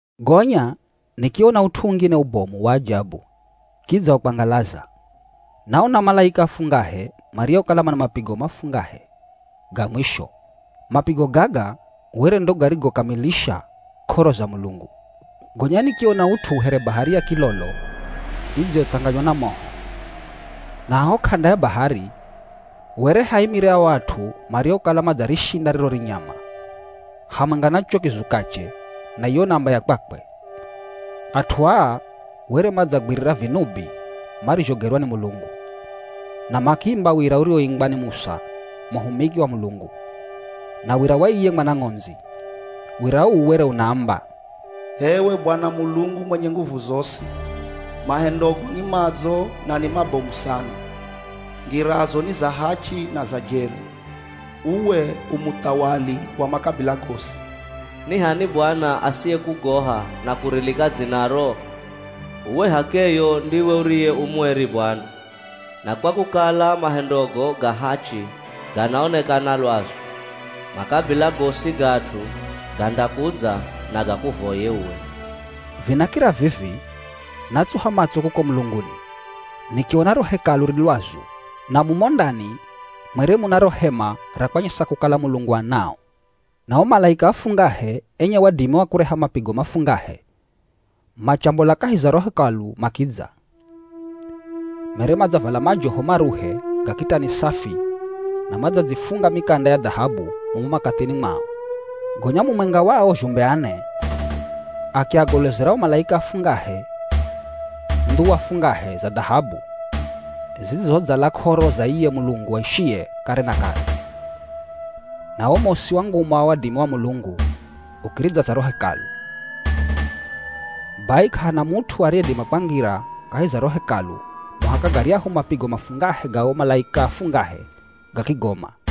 Gonya nikiona ut'u ungine ubomu wa ajabu kidza wa kwangalaza. Naona malaika afungahe mariokala mana mapigo mafungahe ga mwisho. Mapigo gaga were ndo garigokamilisha k'oro za Mulungu. Gonya nikiona ut'u here bahari ya kilolo idziyotsanganywa na moho. Na haho k'anda ya bahari were haimire ao at'u mariokala madzarishinda riro rinyama, hamwenga na cho kizukache na iyo namba ya kwakwe. At'u aa were madzagwirira vinubi marizhogerwa ni Mulungu. Na makiimba wira uriwoimbwa ni Musa muhumiki wa Mulungu, na wira wa iye Mwana Ng'ondzi. Wira uu were unaamba, “H'ewe Bwana Mulungu mwenye nguvu zosi, mahendogo ni madzo na ni mabomu sana! Ngirazo ni za hachi na za jeri, uwe u muthawali wa makabila gosi. Ni h'ani Bwana asiyekugoha na kurilika dzinaro? Uwe h'akeyo ndiwe uriye u mueri Bwana. Na kwa kukala mahendogo ga hachi ganaonekana lwazu, makabila gosi ga at'u gandakudza na gakuvoye uwe.” Vinakira vivi, natsuha matso kuko mulunguni, nikiona ro hekalu ri lwazu na mumo ndani mwere muna ro hema ra kwanyesa kukala Mulungu anao. Na o malaika afungahe enye wadimi wa kureha mapigo mafungahe, machambola kahi za ro Hekalu makidza. Mere madzavala majoho maruhe ga kitani safi na madzadzifunga mikanda ya dhahabu mumo makathini mwao. Gonya mumwenga wa ao zhumbe ane, akiagolozera o malaika afungahe ndhuwa fungahe za dhahabu zidzizodzala k'oro za iye Mulungu aishiye kare na kare. Na wo mosi wa nguma na wadimi wa Mulungu ukiridzaza ro hekalu. Bai k'ahana mut'u ariyedima kwangira kahi za ro Hekalu muhaka garyahu mapigo mafungahe ga o malaika afungahe gakigoma.